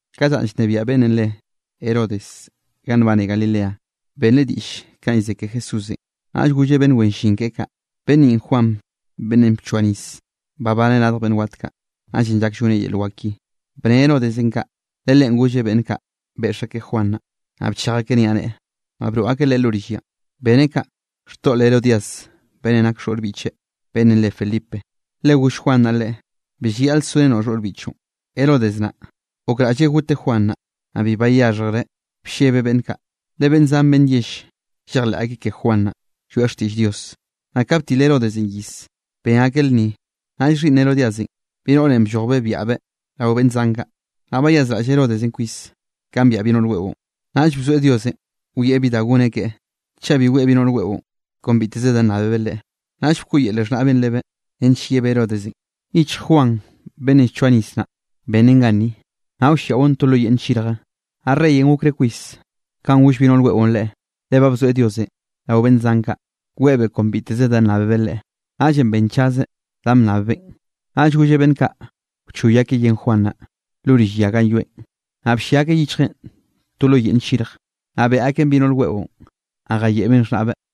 Ka llanꞌ llnebiaꞌ beꞌnnenꞌ re Herodesenꞌ ganꞌ nbane Galileanꞌ benreꞌ diꞌll kanꞌ llze ke Jesúsenꞌ. Naꞌll golleꞌ beꞌnn wen llin keꞌe kaꞌ: —Beꞌnn ninꞌ Juan beꞌnnenꞌ bchoa nis babaneꞌ radj beꞌnn wat kaꞌ, naꞌllenꞌ llak lloneꞌ yel wak ki. Bne Herodesenꞌ kaꞌ le leꞌen golleꞌ beꞌnn kaꞌ beꞌx akeꞌ Juan naꞌ, naꞌ bchej akeꞌ niaꞌneꞌe, naꞌ broꞌ akeꞌ leꞌe lo rill yanꞌ. Beneꞌ kaꞌ, xtoꞌl Herodías beꞌnnenꞌ nak xhoꞌr biꞌcheꞌ beꞌnnenꞌ re Felipe. Le goll Juan naꞌ leꞌe: —Bi llayaꞌle sorenoꞌ xhoꞌr biꞌchoꞌn. Herodes naꞌ, gokraꞌlleꞌ goteꞌ Juan naꞌ, naꞌ bi bayaxhjreꞌ, bllebeꞌ beꞌnn kaꞌ, le beꞌnn zan beꞌnn yell llejleꞌ akeꞌ ke Juan naꞌ, lloeꞌ xtiꞌll Dios. Naꞌ ka btil Herodesenꞌ iz, ben akeꞌ lnni, naꞌll xhiꞌnn Herodíasenꞌ bi noꞌre bllojbeꞌ byaꞌbeꞌ rao beꞌnn zan kaꞌ. Naꞌll bayazraꞌll Herodesenꞌ kwis kanꞌ byaꞌ bi noꞌr weꞌon. Naꞌll bzoeꞌ Diosenꞌ wieꞌ bi da goneꞌ keꞌe, chaꞌ bi weꞌe bi noꞌr weꞌon kon biteze nnábebeꞌ leꞌe. Naꞌll bkoꞌyele xhnaꞌbeꞌn lebeꞌ nench yebeꞌ Herodesenꞌ: —Yichj Juan beꞌnnenꞌ llchoa nis naꞌ, bennen ganni, naꞌ wlliaꞌon to lo yeꞌnn nllirje. Naꞌ reyenꞌ gokreꞌ kwis kanꞌ goll bi noꞌr weꞌon leꞌen, le ba bzoeꞌ Diosenꞌ rao beꞌnn zan kaꞌ weꞌebeꞌ kon biteze da nnábebeꞌ leꞌe, naꞌllenꞌ benchazeꞌ danꞌ bnnabbeꞌn. Naꞌll golleꞌ beꞌnn kaꞌ wchoy akeꞌ yen Juan naꞌ, lo rill ya ganꞌ yoeꞌn. Naꞌ bllia akeꞌ yichjeꞌn to lo yeꞌnn nllirje, naꞌ beꞌe akeꞌn bi noꞌr weꞌon, naꞌ jayeꞌbeꞌn xhnaꞌbeꞌ.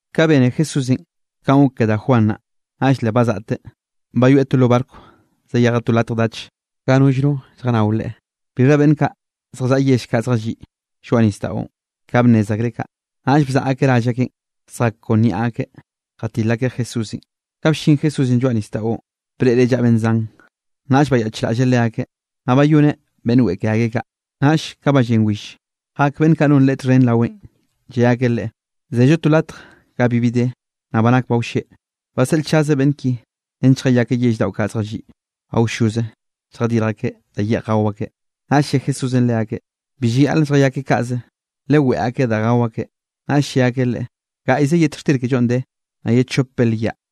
Ka bene Jesúsenꞌ kanꞌ gok ke da Juan naꞌ, naꞌll le bazaꞌteꞌ, bayoeꞌ to lo barco zayejeꞌ to latj dach ga nollno lljannao Leꞌe. Bixha beꞌnn kaꞌ zjallaꞌa yell kaꞌ zjalliꞌ lloaꞌ nisdaꞌon, ka bnnez akreꞌ kaꞌ, naꞌll bzaꞌa akeꞌ rall akeꞌn zjak kon niaꞌ akeꞌ jatil akeꞌ Jesúsenꞌ. Ka ballín Jesúsenꞌ lloaꞌ nisdaꞌon, breꞌreꞌ llaꞌa beꞌnn zan, naꞌll bayaꞌchraꞌlleꞌ leakeꞌ. Naꞌ bayoneꞌ beꞌnn weꞌe ke akeꞌ kaꞌ. Naꞌll ka ba llen will, jak beꞌnn kaꞌ non Leꞌe txhen raweꞌn, lle akeꞌ leꞌe: —Zello to latj ga bibi de, naꞌ ba nak ba wlleꞌ. Baseꞌlchaz beꞌnn ki nench lljayakeꞌ yell daꞌo kaꞌ lliꞌ awlloze lljadirj akeꞌ da yeꞌj gao akeꞌ. Naꞌll lle Jesúsenꞌ leakeꞌ: —Bi llayaꞌl lljayakeꞌ kaꞌze, reꞌ leweꞌe akeꞌ da gao akeꞌ. Naꞌll lle akeꞌ Leꞌe: —Gaꞌyze yet xtir kellonꞌ de, naꞌ ye chop belyaꞌ.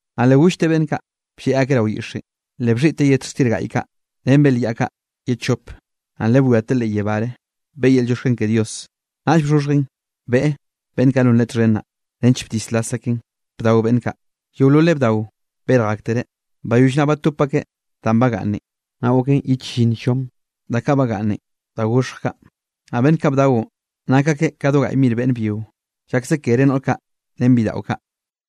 Naꞌ le gollteꞌ beꞌnn kaꞌ blleꞌ akeꞌ rao yiꞌxenꞌ. Le bxhiꞌteꞌ yet xtir gaꞌy kaꞌ ren belyaꞌ kaꞌ ye chope, naꞌ le bwiateꞌ leꞌ yebáre beꞌe yel llioxken ke Dios, naꞌll bxhoxhjen beꞌe beꞌnn kaꞌ non Leꞌe txhen naꞌ, nench bdislas akeꞌn bdao beꞌnn kaꞌ. Yeololeꞌ bdao berj aktereꞌ. Bayoll naꞌ batop akeꞌ danꞌ bagaꞌnnen, naꞌ goken ye chllinn llom da kaꞌ bagaꞌnnen da goxhj kaꞌ. Naꞌ beꞌnn kaꞌ bdaonꞌ nak akeꞌ ka do gaꞌy mir beꞌnne byio, llakze kere noꞌr kaꞌ ren bidaꞌo kaꞌ.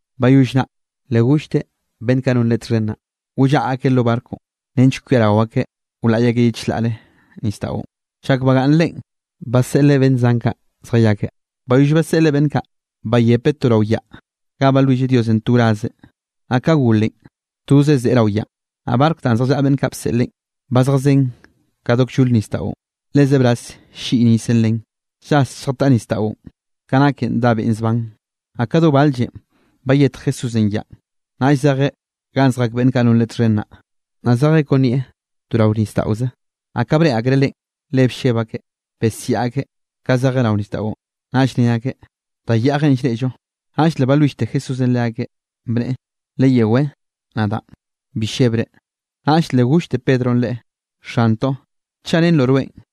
Bayoll naꞌ, le gollteꞌ beꞌnn kaꞌ non Leꞌe txhen naꞌ, wllaꞌa akeꞌ lo barconꞌ nench kwiarao akeꞌ wlaꞌy akeꞌ ye chlaꞌre nisdaꞌon, chak bagaꞌnn Leꞌen, baseꞌleꞌ beꞌnn zan kaꞌ zjayakeꞌ. Bayoll baseꞌleꞌ beꞌnn kaꞌ, bayepeꞌ to rao yaꞌ ga balwilleꞌ Diosenꞌ to wraze, naꞌ ka golenꞌ, tozeꞌ zeꞌe rao yaꞌn. Naꞌ barconꞌ danꞌ zjallaꞌa beꞌnn kaꞌ bseꞌlen, ba zjazén ka do kllol nisdaꞌon, le zebraz ll-lliꞌy nisenꞌ len, llas lljataꞌ nisdaꞌon, ka naken dá beꞌn zban. Naꞌ ka do bal-llen bayetj Jesúsenꞌ yaꞌn, naꞌll zejeꞌ ganꞌ zjak beꞌnn kaꞌ non Leꞌe txhen naꞌ, naꞌ zejeꞌ kon nieꞌ to rao nisdaꞌoze. Naꞌ ka breꞌe akreꞌ Leꞌen, le blleb akeꞌ, besiaꞌ akeꞌ ka zejeꞌ rao nisdaꞌon. Naꞌll ne akeꞌ: —¡Da yaꞌjenꞌ llreꞌllo! Naꞌll le balwillte Jesúsenꞌ leakeꞌ, bneꞌe: —¡Leyewé, nadaꞌn, bi llebre! Naꞌll le gollte Pedronꞌ Leꞌe: —Xantoꞌ, chaꞌ rennroꞌ rweꞌn,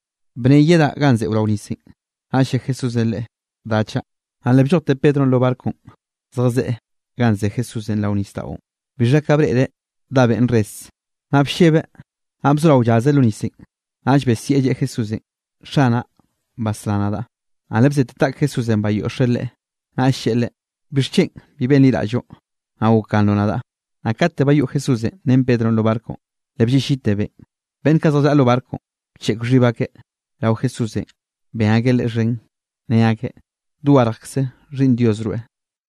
bne yedaꞌ ganꞌ zeꞌo rao nisenꞌ. Naꞌll lle Jesúsenꞌ leꞌe: —Da chaꞌ. Naꞌ le bllojte Pedronꞌ lo barconꞌ zejzeꞌ ganꞌ ze Jesúsenꞌ rao nisdaꞌon. Bixha ka breꞌreꞌ dá beꞌn res, naꞌ bllebeꞌ naꞌ bzorao llazeꞌ lo nisenꞌ. Naꞌll besieꞌ lleꞌe Jesúsenꞌ: —¡Xanaꞌ, basrá nadaꞌ! Naꞌ le bzete taꞌk Jesúsenꞌ bayoꞌxeꞌ leꞌe, naꞌll lleꞌe leꞌe: —¿Bixchen bi benliraꞌlloꞌ, naꞌ gokganroꞌ nadaꞌ? Naꞌ kate bayoꞌ Jesúsenꞌ ren Pedronꞌ lo barconꞌ, le blleꞌllite beꞌn. Beꞌnn kaꞌ zjallaꞌa lo barconꞌ bcheꞌk xhib akeꞌ rao Jesúsenꞌ ben akeꞌ Leꞌe xhen, ne akeꞌ: —Dogarjkze Xhiꞌnn Dios rweꞌ.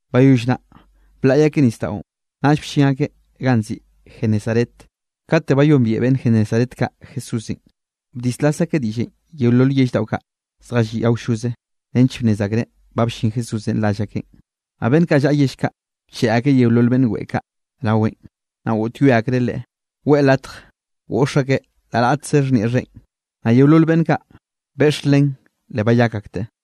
Bayoll naꞌ blaꞌy akeꞌ nisdaꞌon, naꞌll bllin akeꞌ ganꞌ nziꞌi Genesaret. Kate bayombiaꞌ beꞌnn Genesaret kaꞌ Jesúsenꞌ, bdislas akeꞌ diꞌllenꞌ yeolol yell daꞌo kaꞌ zjalliꞌ awlloze nench bnnez akereꞌ ba bllin Jesúsenꞌ rall akeꞌn. Naꞌ beꞌnn kaꞌ llaꞌa yell kaꞌ, bcheꞌe akeꞌ yeolol beꞌnn weꞌe kaꞌ raweꞌn. Naꞌ goꞌtyoe akreꞌ Leꞌe weꞌe latj goꞌx akeꞌ la raꞌtze xhnieꞌ xheꞌen, naꞌ yeolol beꞌnn kaꞌ beꞌx len le bayak akteꞌ.